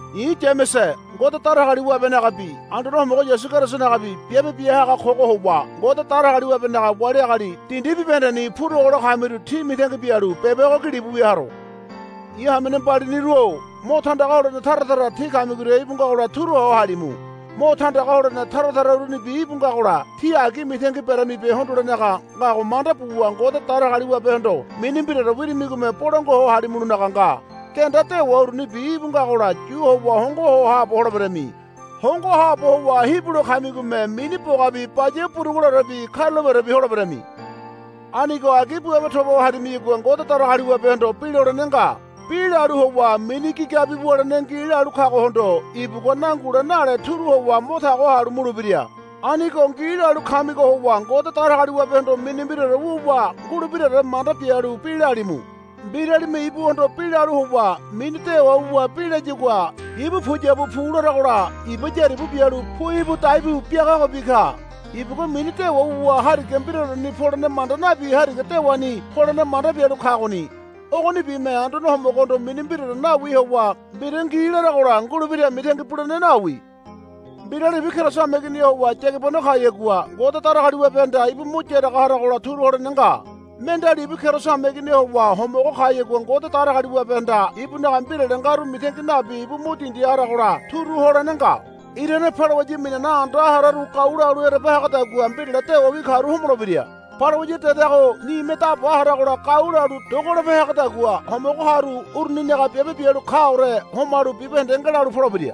I̱ Yamese Ngode Datagaliwabenagabi Anduane Homogo Yasu Kerisonagabi biabe bia haga kogo howa Ngode Datagaliwabenaga wali agali dindi bibahendeni purogo lo kamiru tí mitangi bialu beba ogo gilibu wia haro. I̱ hamene mbaliniru-o mo tandaga holene tara tara tí kamigoria íbu ngagola turuho halimu. Mo tandaga holene tara tara urunibi íbu ngagola tí agi mitangi beramibe hondolenaga ngago manda buwa Ngode Datagaliwabehondo mini mbiraore wirimigome bolangua ho halimulonaga nga. Genda dewa urunibi íbu ngagola yu howa hongo ho haabo holeberami. Hongo haabo howa hibulo kamigome mini bogabi baya buruguleorebi karulapeorebi holeberami. Anigo agi buabe toba ho harimiyagua Ngode Datagaliwabehondo bi lolene nga. Bi lalu howa mini gigabi wulene ngi lalu kagohondo ibugua nangule nale turu howa mo tago halu mulebira. Anigo ngi lalu kamigo howa Ngode Datagaliwabehondo mini mbiraore wuwa ngulebiraore manda bialu bi lalimu. Mbiralime ibuhondo bi lalu howa mini dewa wuwa bi layagua ibu puyabu pu laragola iba yaribu bialu pu íbu dai bu biagagobi ka. Ibugua mini dewa wuwa hariga mbiraoreni polene manda nabi hariga dewani polene manda bialu kagoni. Ogonibime Anduane Homogohondo mini mbiraore nawi howa mbira ngi laragola ngulebira mitangi bulene nawi. Mbirali ibu Keriso hameigini howa yagibano kayagua Ngode Datagaliwabehanda ibu mo yaraga haragola turu holene nga. Mendeali ibu Keriso hameigini howa homogo kayagua Ngode Datagaliwabehanda ibunaga mbirale ngaru mitangi nabi ibu mo dindi haragola turu holene nga. Irane balawaya minane anda hararu gau lalu ereba hagadagua mbirale dewawi karu homolebira. Balawaya dedago nime da ba haragola gau lalu dogolope hagadagua homogo karu uruninaga biabe bialu kaore homalu bibahende ngelalu polebira.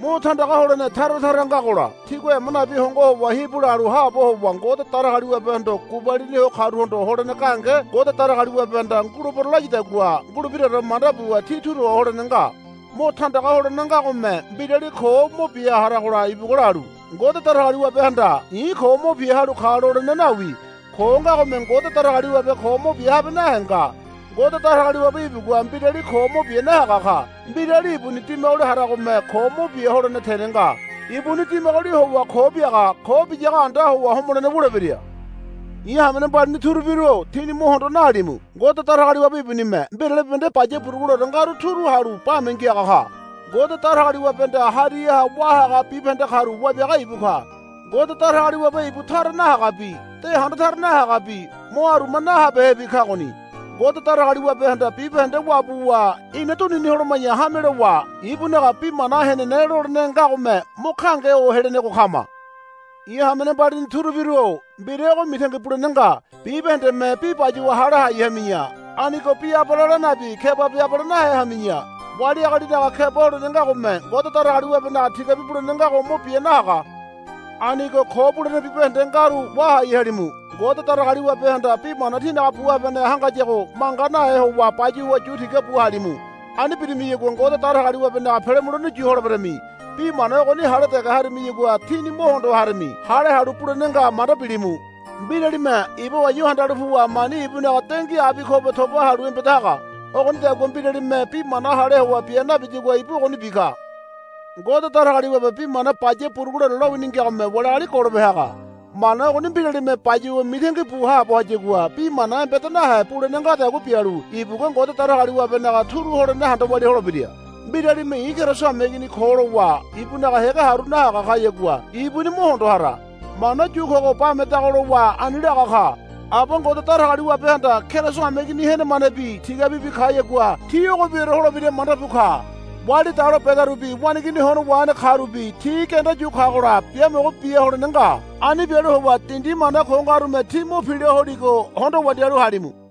Mo tandaga holene tara tara ngagola tígua ema nabi hongo howa hibu lalu haabo howa Ngode Datagaliwabehondo gubalini ho karuhondo holene gahenge Ngode Datagaliwabehanda, Ngulebero, layadagua ngulebiraore manda buwa tí turu holene nga. Mo tandaga holene ngagome mbirali ko mo bia haragola ibugua lalu, Ngode Datagaliwabehanda i̱ ko mo bia halu ka, lolene nawi. Ko ngagome Ngode Datagaliwabe ko mo bia habe nahe nga. Ngode Datagaliwabe ibugua mbirali ko mo bia nahaga ka. Mbirali ibuni dimagoli haragome ko mo bia holene tene nga. Ibuni dimagoli howa ko biaga. Ko biyago anda howa homolene wulebira. I̱ hamene mbalini turubiru-o tíni mo hondo nahalimu. Ngode Datagaliwabe ibunime mbirale bibahende baya buruguleore ngaru turu halu bame ngiaga ka. Ngode Datagaliwabehanda hariha wá haga bibahende karu Wabiaga ibu ka. Ngode Datagaliwabe ibu tara nahagabi de handa tara nahagabi mo aruma nahabehebi kagoni. Ngode Datagaliwabehanda bibahende wabuwa ina dunini holoma̱ya hame lowa ibunaga bi mana henene lolene ngagome mo gahenge ho helenego kama. I̱ hamene mbalini turubiru-o mbira ogo mitangi bulene nga. Bibahendeme bi bayuwa hale hai hami̱ya. Anigo bi abale la nabi kebabi abale nahe hami̱ya. Wali agalinaga keba holene ngagome Ngode Datagaliwabenaga tigabi bulene ngago mo bia nahaga. Anigo ko bulene bibahende ngaru wahai halimu. Ngode Datagaliwabehanda bi mana tínaga bu habaneha hangayago manga nahe howa bayuwa yu tigabu halimu. Ani birimiyagua Ngode Datagaliwabenaga pele mulene yu holeberami. Bi mana ogoni hale dege harimiyagua tíni mo hondo harami. Hale halu bulene nga manda bilimu. Mbiralime iba wa̱yu̱ handalu puwa mani ibunaga dengui abi kobe toba halu embeda haga. Ogonidagua mbiralime bi mana hale howa bia nabiyagua ibu ogonibi ka. Ngode Datagaliwabe bi mana baya buruguleore lowini ngagome wali agali golope haga. Mana ogoni mbiralime bayuwa mitangi bu haabo hayagua bi mana embeda nahe bulene ngadagua bialu ibugua Ngode Datagaliwabenaga turu holene handa walia holebira. Mbiralime, I̱ Keriso hameigini ko, lowa ibunaga hége haru nahaga kayagua ibuni mo hondo hara. Mana yu kogo bamedago lowa ani laga ka. Aba Ngode Datagaliwabehanda Keriso hameigini henemanebi tigabibi kayagua ti ogobiore holebira manda bu ka. Wali dalo bedarubi waneigini hono wahene karubi ti genda yu kagola biamogo bia holene nga. Ani bialu howa dindi mana ko ngarume tí mo pila holigo hondo wandialu halimu.